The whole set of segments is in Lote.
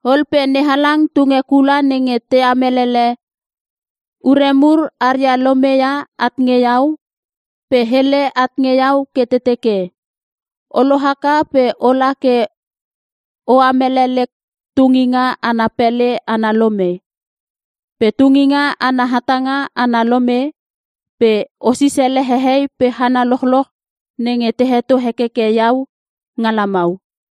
Ol pe NeHalang tunge kula nenge te amelele ure mur aria lome ia at nge iau, pe hele at nge iau ke te teke, “O lohaka pe ola ke o amele lek tunginga ana pele ana lome, pe tunginga ana hatanga ana lome, pe o sisele hehei pe hana lochloch nenge te heto hekeke Iau nga lamau.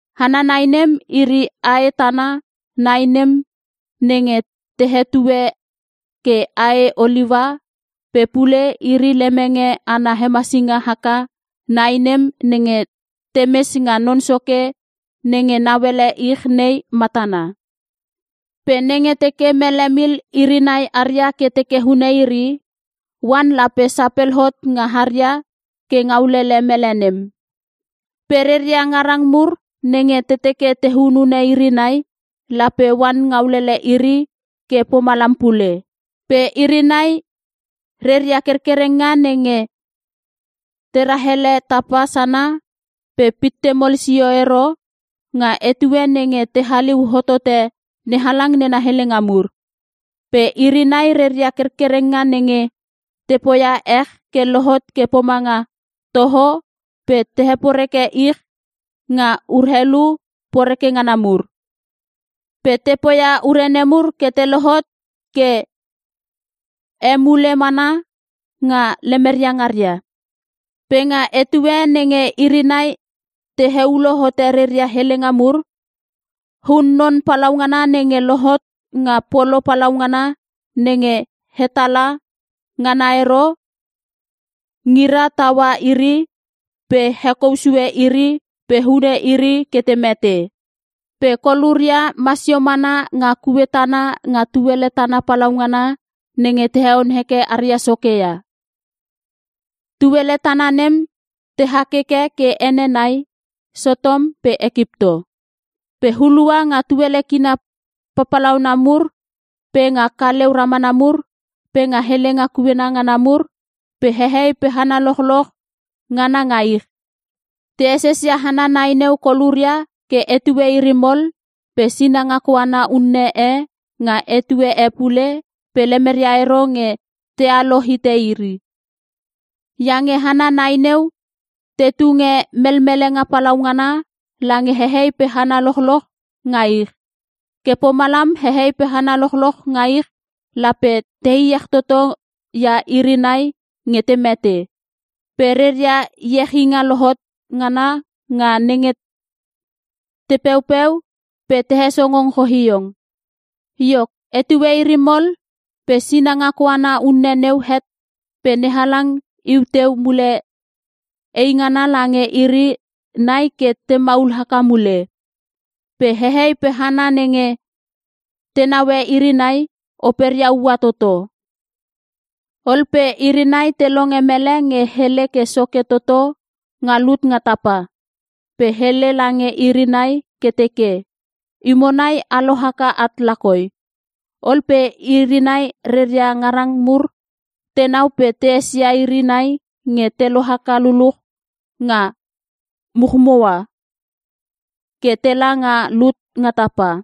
Hana nai nem, iri ae tana nai nem nenge te hetue ke ae oliua pe pule, iri lemenge ana hemesinga haka nai nem nenge temes nga Non Soke nenge nauele ich nei matana. Pe nenge teke mele mil iri nai aria ke teke hune iri, oan lape sapel hot nga haria ke ngaulele mele nem. Pe reria ngarang mur nenge te teke te hunune iri nai, lape oan ngaulele iri ke pomalam pule. Pe iri nai reria kerkerenga nenge te rahele tapa sana ke pitte mol sio ero, nga etue nenge te haliu hotote NeHalang nena helenga mur. Pe iri nai reria kerkerenga nenge te poia ech ke lohot ke pomanga toho pe te heporeke ich nga urelu poreke ngana mur. Pe te poia ure nemur ke te lohot ke emule mana nga lemeria ngaria. Pe nga etue nenge iri nai te heulo hote reria helenga mur, hun-non palaungana nenge lohot nga polo palaungana nenge hetala ngana ero, ngira taua iri pe hekou sue iri pe hune iri ke te mete. Pe koluria masio mana nga kue tana nga tuele tana palaungana nenge te heon heke aria Soke ia. Tuele tana nem te hakeke ke ene nai; Sotom pe Ekipto. Pe hulua nga tuele kina papalauna mur, pe nga kaleu ramana mur, pe nga helenga kuena ngana mur, pe hehei pe hana lochloch ngana nga ich, te esesia hana nai neu koluria ke etue iri mol pe sinanga koana unne e nga etue e pule pe lemeria ero nge tealo hite iri. Iange hana nai neu te tunge melmelenga palaungana lange hehei pe hana lochloch nga ich. Ke pomalam hehei pe hana lochloch nga ich lape te iech toto ia iri nai nge te mete. Pe reria iechinga lohot ngana nga nenge te peupeu pe te hesongong choiong. Iok, etue iri mol pe sinanga koana unne neu het pe NeHalang iu teu mule eingana lange iri nai ke te maul haka mule. Pe hehei pe hana nenge te naue iri nai, operia ua toto. Ol pe iri nai te longe mele nge hele ke soke toto nga lut nga tapa. Pe hele lange iri nai ke teke, “Imo nai a lohaka at lakoi!” Ol pe iri nai reria ngarang mur tenau pe te esia iri nai nge te lohaka luluch nga muchmua ke tela nga lut nga tapa.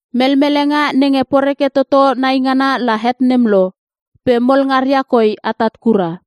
Melmelenga nenge poreke toto naingana la het nem lo, pe mol ngaria koi atat kura.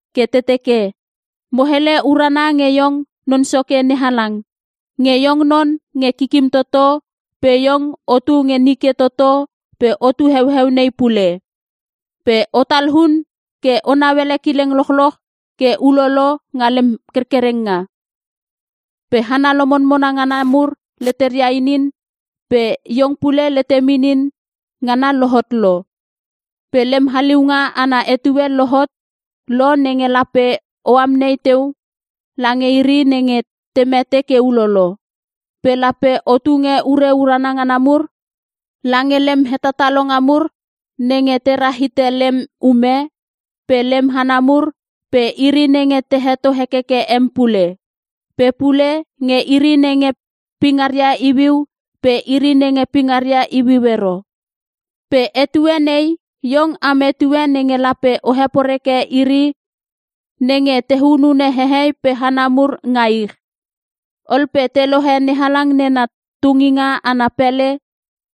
ke te teke, “Mo hele urana nge iong Non Soke NeHalang, nge Iong non nge Kikim Toto pe iong o tu nge nike toto pe otu heueu nei pule. Pe o talun ke o nauele kileng lochloch ke ulolo nga lem kerkerenga. Pe hana lomonmona ngana mur leteria inin pe Iong pule letem inin ngana lohot lo. Pe lem haliunga ana etue lohot lo nenge lape o amnei teu lange iri nenge te mete ke ulolo. Pe lape o tunge ure urana ngana mur lange lem hetatalonga mur nenge te rahite lem ume, pe lem hana mur, pe iri nenge te heto hekeke em pule. Pe pule nge iri nenge pingaria iuiu pe iri nenge pingaria iuiu ero. Pe etue nei, Iong am etue nenge lape o heporeke iri nenge te hunune hehei pe hana mur nga ich.” Ol pe te lohe NeHalang nena tunginga ana pele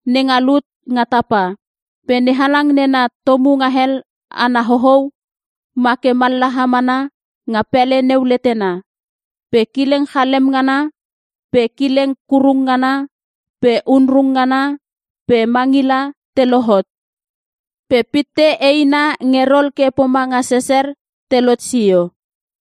nenga lut nga tapa. Pe NeHalang nena tomungahel ana hohou, ma ke mallaha mana nga pele neu letena. Pe kileng chalem ngana, pe kileng kurung ngana, pe onrung ngana, pe mangila te lohot. Pe pitte eina nge rol ke pomanga sesser telot sio.